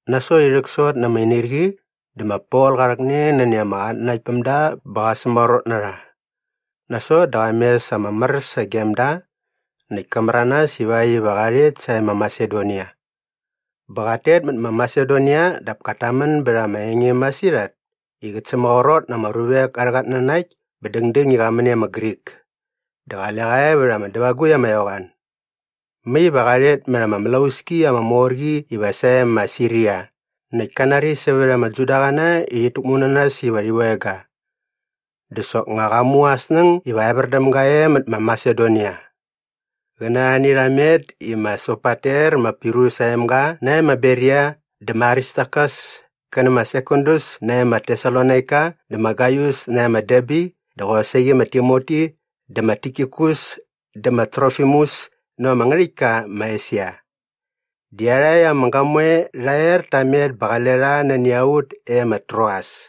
Nasot i rhäksot na ama inirqi dä ma Pol qa rhäkne nani ama qatnanaktpämda bä qa sämaqrot na rha. Nasot dä qa mes ama mär sagem da näkt ka märanas ivakt iva qa rhet sae ma Masedonia. Bä qat tet mät ma Masedonia dap kat tamän bät ama enge masirhat i qät sämaqrot na ama ruvek arhä qatnanakt bä dängdäng i qa män e ma Grik. Dä qale qa e vät ama dävagukt ama eqoan. Mai iva qa rhet mät ama mlauski ama mor qi iva sae ma Siria näkt ka nari sävät ama Judaqäna i rhit täkmu na nas iva rhi veng ga. Dä soknga qa mu aa snäng iva evär däm ga e mät ma Masedonia. Qä na arhani rha met i ma Sopater ma Pirus aa emga nae ma Beria dä ma Aristarkas kä nä ma Sekundus nae ma Tesalonaika dä ma Gaius nae ma Derbe dä qosaqi ma Timoti dä ma Tikikus dä ma Trofimus näva ama ngärhäktka ma Esia. Di iarhakt ama gamoe rha er ta met bä qale rha nani a ut e ma Troas.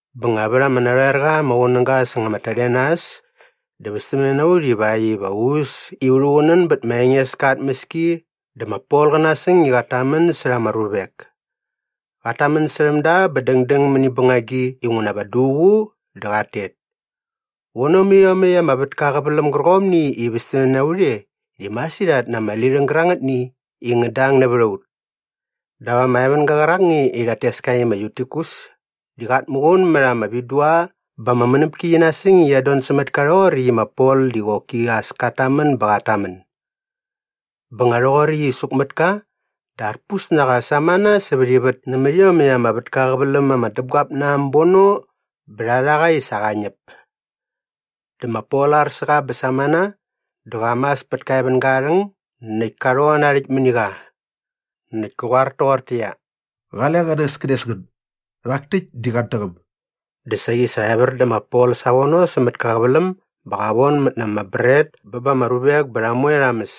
Bä nga vät ama narhoer qa ama qunäga säng ama tadenas dä västämne na ut ivakt iva u äs i u rhuqunän bät ma Engeska aa tmäski dä ma Pol qä nasäng i qat tamän särha ama ruvek. Qat tamän särhäm da bä dängdäng mäni bängagi inguna va duququ dä qat tet. Vono mät iomäkt ama vätka aa qäväläm gärqomni i västämne na ut e di masirhat na ama lirhäng gärangätni i ngät dang nävät a ut. Dap ama evänga qärakni i rhat tes ka i ma Yutikus di qat muqun mät ama vidua bä ama mänäpki qi nasäng i qiat don sämät ka rhoqoräkt i ma Pol di qoki as kat tamän bä qat tamän. Bä nga rhoqoräkt i suk mät ka dä arpus na qa samana sävät ivät nämät iomäkt ama vätka aa qäväläm ama däpguap na äm bono bä rha rha qa i sa qa ñäp. Dä ma Pol ar sä qa bä samana dä qa mas pät ka evänga aa rhäng näkt ka rhon na aa rhäkt mäni qa. Näkt kä qoar toqortäqyia, “Qale qänäskänes ngän. Rhak täkt di qat däqäm.” Dä saqi sa evär dä ma Pol savono sämät kä qäväläm bä qa vonmät na ama bret bä ba ama ruvek bä rha moe rha mäs.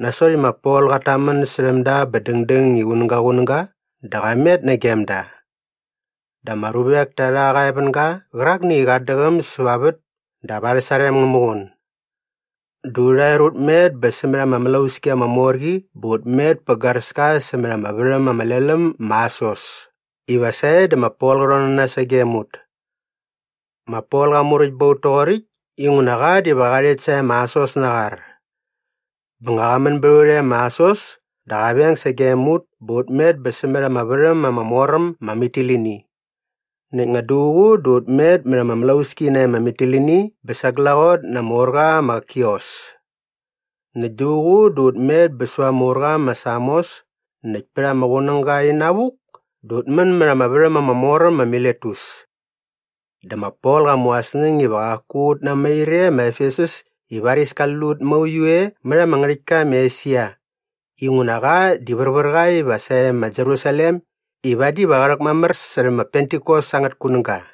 Nasot i ma Pol qat tamän särhäm da bä dängdäng i qunäga qunäga dä qa met nagem da. Dä ama ruvek ta rha qa evänga qärakni i qat däqäm säva aa vät dap arhä sarem ngä muqun. Dä urha er ut met bä sämät ama mlauski ama mor qi bä ut met pä garäska sämät ama värhäm ama lel äm ma Asos iva sae dä ma Pol qä rhon na nas sagem ut. Ma Pol qa muräkt ba ut toqoräkt inguna qa diva qa rhet sae ma Asos na aa qar. Bä nga qa män bät a ut e ma Asos dä qa veng sagem ut bä ut met bä sämät ama värhäm ama mor äm ma Mitilini. Näkt nga duququ dä ut met mät ama mlauski nae ma Mitilini bä sa glaqot na ama urqa ma Kios. Näkt duququ dä ut met bä säva ama urqa ma Samos näkt pät ama qunäga inavuk dä ut män mät ama värhäm ama mor äm ma Miletus. Dä ma Pol qa mu aa snäng iva qaku ut namair e ma Efesus i varis kali lut mauiu e mät ama ngärhäktka ma Esia inguna qa di värvär qa iva sae ma Jerusalem i vadi va qä rhäkmamär särhä ma Pentikos angät kunäga.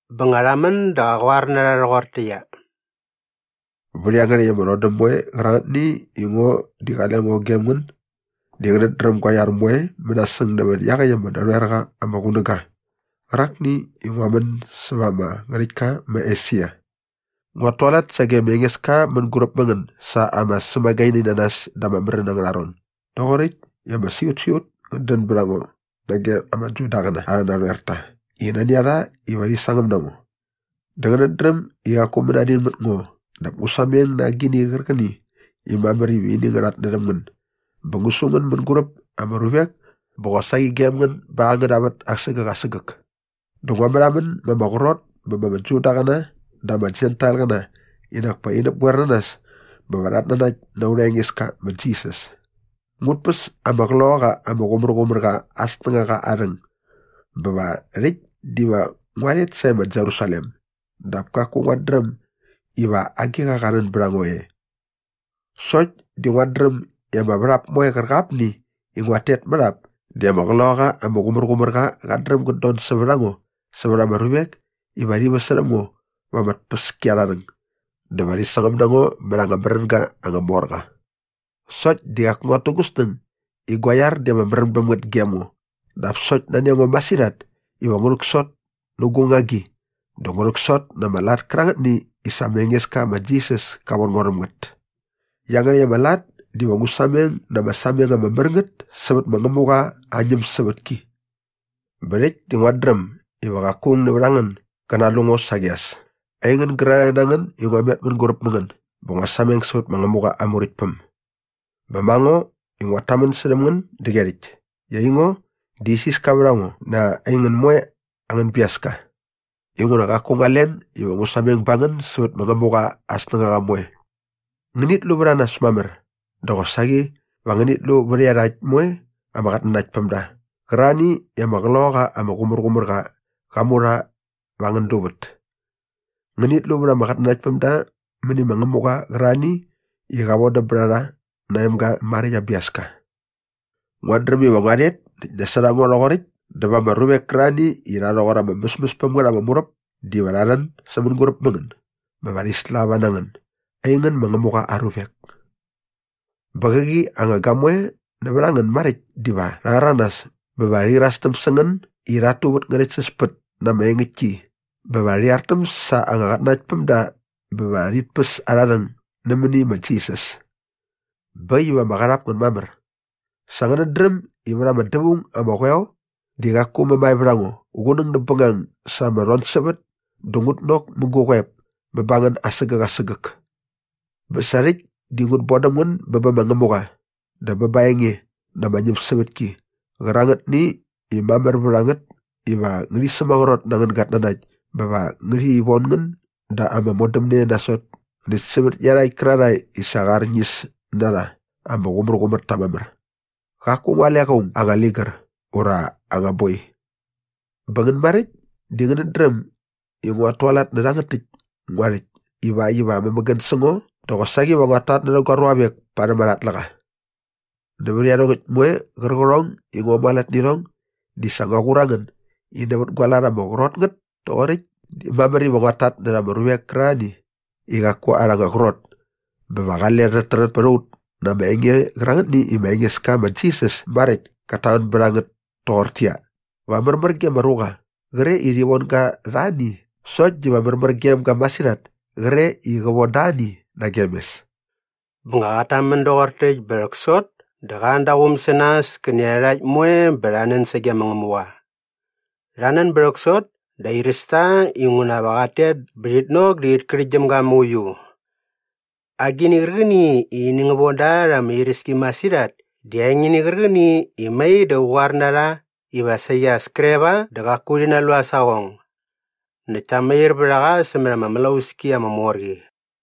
Bä nga rha män dä qa qoar na rha rhoqortäqyia, “Vät iangärhäkt ama rhodäm moe qärangätni i ngo di qale ngo gem ngän di ngänät dräm gua iar moe mänasäng nävät iaqäkt ama narhoer qa ama qunäga qärakni i ngua män säva ama ngärhäktka ma Esia. Nguat tualat sage ma Engeska mänguräp mä ngän sa ama sämagaininanas da ama märän angärha ron doqoräkt i ama siqutsiqut ngät dän bät a ngo nage ama Judaqäna arhä narhoerta i nani a rha iva rhi sangäm na ngo. Dä ngänät dräm i qaku mänadin mät ngo dap ngu sameng na agini qärqäni i mamär iva ini ngä rhatnärhäm ngän bä ngu su ngän mänguräp ama ruvek bä qosaqi gem ngän ba angäna vät asägäk asägäk. Dä ngua märhamän ma ama qrot bä ba ama Judaqäna dä ama Jentailqäna i nak pa rhi näpgoer na nas bä va rhat nanakt na aurha Engeska ma Jisas. “Ngut päs ama Qloqaqa ama Qumärqumärqa aa snängaqa aa rhäng bä va rhäkt diva ngua rhet sae ma Jerusalem dap kaku nguat dräm iva agiqa qa rhän bät a ngo e. Sokt di nguat dräm i ama värhap moe qärqapni i nguat tet mät ap di ama Qloqaqa ama Qumärqumärqa qat dräm gät don sävät a ngo sävät ama ruvek iva rhi väsärhäm ngo va ama tpäskiarharhäng dä va rhi sangäm na ngo mät anga märänga anga mor qa. Sokt di qaku nguat tu gu snäng i gua iar di ama märän bäm ngät gem ngo dap sokt nani a ngo masirhat iva ngu rhäksot nä gu ngagi dä ngu rhäksot na ama lat kärangätni i sa ma Engeska ma Jisas ka von ngo rhäm ngät. Iangärhäkt ama lat diva ngu sameng na ama sameng ama mär ngät sävät ma Ngämuqa aa ñämsävätki. “Bä rhäkt di nguat dräm iva qaku aung nävät a ngän gä nalu ngo saqi as, aingän gärarhae na ngän i ngua met mänguräp mä ngän bä ngua sameng sävät ma Ngämuqa aa Muräktpäm. Bä ma ngo i nguat tamän särhäm ngän däqyerhäkt i aingo di isiska vät a ngo na aingän moe angän biaska. Inguna qaku ngua len iva ngu sameng ba ngän sävät ma Ngämuqa aa snängaqa moe. Ngänit lu vät a nas mamär dä qosaqi va ngänit lu vät iarhakt moe ama qatnanaktpämda qärarhani i ama Qloqaqa ama Qumärqumärqa qa mu rha va angän luvät. Ngänit lu vät ama qatnanaktpämda mäni ma Ngämuqa qärarhani i qa vodäm bät a rha na aa emga maräkt aa biaska. “Nguat dräm iva ngua rhet näkt nasot a ngo rhoqoräkt dä va ama ruvek kärarhani i rha rhoqor ama mäsmäs päm ngät ama muräp diva rha rhän sä mänguräp mä ngän bä va rhi slava na ngän aingän ma Ngämuqa aa ruvek. Bä qäqi anga gamoe nävät a ngän maräkt diva rha rhäranas bä va rhi irastäm sä ngän i rhat tu vät ngärhäktsäspät na ama engäktki bä va rhi artäm sa anga qatnanaktpämda bä va rhit päs arha rhäng nämäni ma Jisas. Bä äkt iva ama qarhap ngän mamär! Sa ngänät dräm i vät ama dävaung ama qoeo di qaku mämae vät a ngo qunäng näp bängang sa ama rhonsävät dä ngut nok mä gu qoep bä ba ngän asägäk asägäk. “Bä sa rhäkt di ngut bodäm ngän bä bä ma Ngämuqa dä bä ba aa enge na ama ñämsävätki qärangätni i mamär vät a ngät iva ngärhi sämaqrot na angän gatnanakt bä va ngärhi von ngän da ama modämne nasot näkt sävät iarhakt kärarhae i sa qa arñis na rha i ama qumärqumär ta mamär. Qaku ngua alek aung aa anga ligär ura aa anga boi. Bä ngän maräkt di ngänät dräm i nguat tualat nä rhangät täkt ngua rhäkt ivakt iva amämägän sä ngo dä qosaqi va nguat tatnärhä gua ruavek parhäm arha tläqa. Nävät iarhongäkt moe qärqärhong i ngua mualat nä irhong di sa ngua qur a ngän i nävät gua lat ama qrot ngät toqoräkt di mamär iva ut tatnärha ama ruvek kärarhani i qaku arha anga qrot bä va qale räträt pät a ut na ama enge qärangätni i ma Engeska ma Jisas maräkt kat tamän bät a ngät toqortäqyia, ‘Va märmär ge ama ruqa qre i rhi von ga rha ani sokt diva märmär gem ga masirhat kre i qä von da ani nagem mes.’” Bä nga qat tamän doqor täkt bä rhäksot dä qa an da aa quum sä nas kä nä iarhakt moe bä rha nän sage ma Ngämuqa. Rha nän bä rhäksot dä airäs ta inguna va qat tet bä rhit nok dä rhit kärhäktgyäm ga mauiu. Agini qärqäni i ini ngä von da rha ama iräski masirhat di aa engini qärqäni i mai dä qä qoar na rha iva saqi as kre va dä qaku rhi nalu aa saqong. Näkt ta mair vät a qa sämät ama mlauski ama mor qi.